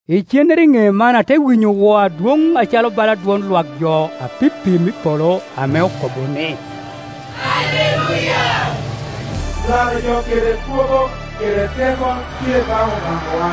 Icennere i ne man ate winyo woo adwoŋ acalo bala dwon lwak jo apipim i polo ame okobo ni, “Aleluya! Laro jo kede kwogo kede teko tye obaŋ obaŋawa,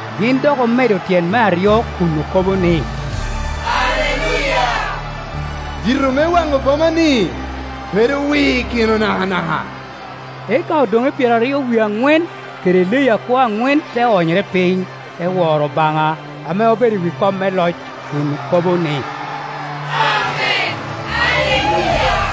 Gin dok omedo tyen me aryo kun okobo ni, “Aleluya! Yito me waŋo boma-ni bedo wikino nakanaka.” Eka odoŋe pyeraryo wie aŋwen kede leyi akwo aŋwen te onyere piny, te woro Obaŋa ame obedo i wi kom me loc, kun okobo ni, “Amen. Aleluya!”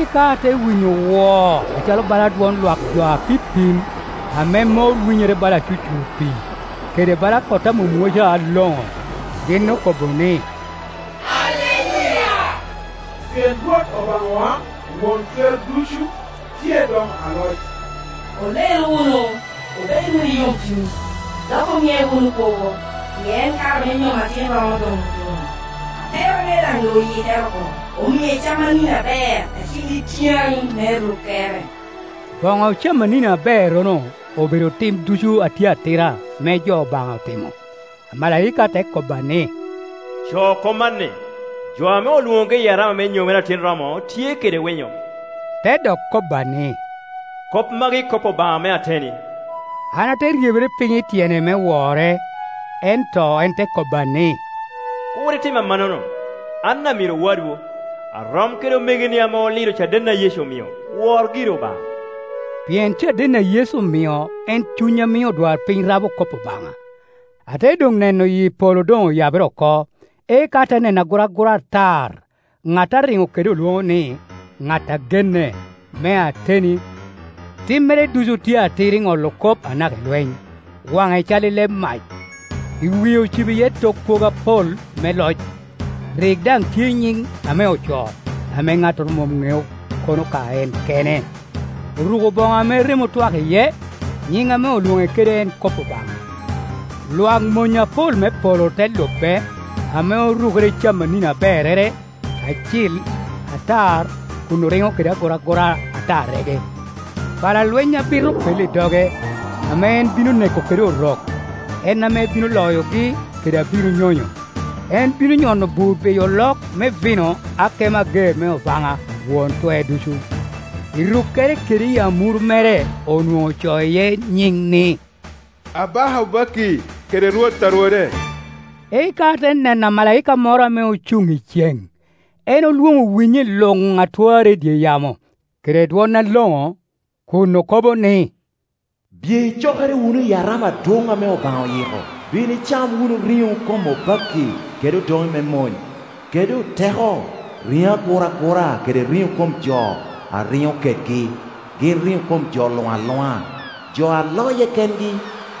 Eka ate winyo woo acalo bala dwon lwak jo apipim, ame mor winyere bala acucur pii, kede bala kot a mwomwoca aloŋo. Gin okobo ni, “Aleluya! Pien Rwot Obaŋawa, Won Twer Ducu, tye doŋ aloc. Olel wunu, obed wunu i yomcuny, dok omie wunu kwogo, pien kare me nyom Atin romo doŋ otuno, atera mere daŋ doŋ oyikere oko, omie camanini aber acil it yan me rukkere.” Boŋo camanini aberrono obedo tim ducu a tye atira ame jo Obaŋa oti mo. Amalaika te kobba ni, “Co kop man ni, ‘Jo ame olwoŋogi i arama me nyomere Atin romo tye kede winyo.’” Te dok kobba ni, “Kop magi kop Obaŋa me ateni.” An ate ryebere piny i tyene me wore, ento en te kobba ni, “Kur itim amannono! An amiro wadwu, arom kede omegoni ame olido caden a Yecu omio. Wor giri Obaŋa.” Pien caden a Yecu omio en cuny a mio odwarpiny rabo kop Obaŋa. Ate doŋ neno yi polo doŋ oyabere oko, eka ate neno aguragura atar. Ŋat a riŋo kede olwoŋo ni, Ŋat a Genne, me Ateni; timmere ducu tye atir i ŋolo kop anaka i lweny. Waŋe cal i leb mac, i wie ocibo iye tok kwogo apol me loc; rik dan tye i nyiŋ ame ocoo, ame ŋattoro mom ŋeo, kono ka en kene. Oruko bono ame remo otwak iye, nyin ame olwone kede en Kop Obaŋa. Lwak mony apol me polo te lube, ame orukere i camanini aberrere, acil, atar, kun oriŋo kede aguragura atarrege. Pala lweny abit opello i doge, ame en bino neko kede orok. En ame bino loyogi kede abiro nyonyo; en bino nyono bur biyo olok me yino akomo ager me Obaŋa Won Twer Ducu. I rukkere kede i amuru mere onwoŋo ocoo iye nyiŋ ni, Abaka obakki kede Rwot a rwode. Eka ate neno amala ika moro ame ocuŋ i cen. En olwoŋo winyi luŋ a twarre i dye yamo kede dwon aloŋo, kun okobo ni, “Biye icokere wunu i arama adwoŋ ame Obaŋa oyi ko. Bin icam wunu riŋo kom obakki, kede odoŋe me mony, kede oteko, riŋo aguragura kede riŋo kom jo a riŋo kedgi, riŋo kom jo luŋ aluŋa, jo a loye kengi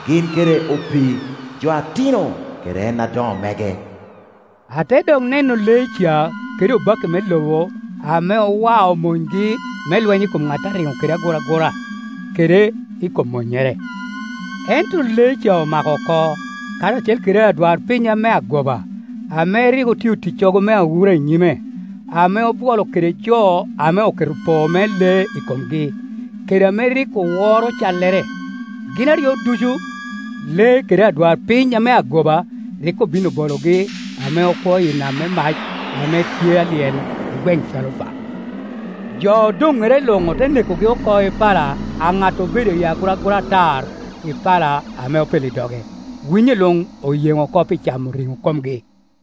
gin kede opii, jo atino kede en adoŋo mege.” Ate dok neno lee ca kede obakki me lobo ame owao monygi me lweny i kom ŋat a riŋo kede aguragura, kede i kom monnyere. Ento lee ca omako oko, karacel kede adwarpiny ame agoba, ame rik otio ticcogo me awura i nyime, ame obwolo kede jo ame oketo poo me lee i komgi, kede ame rik oworo callere. Gin aryo ducu, lee kede adwarpiny ame agoba, rik obin obologi ame okwo i nam me mac, ame tye a lyel i gweŋ calufa. Jo odonŋere luŋ ote nekogi oko i pala a ŋat obedo i aguragura atar, i pala ame opello i doge; winyi luŋ oyen oko pi camo riŋo komgi.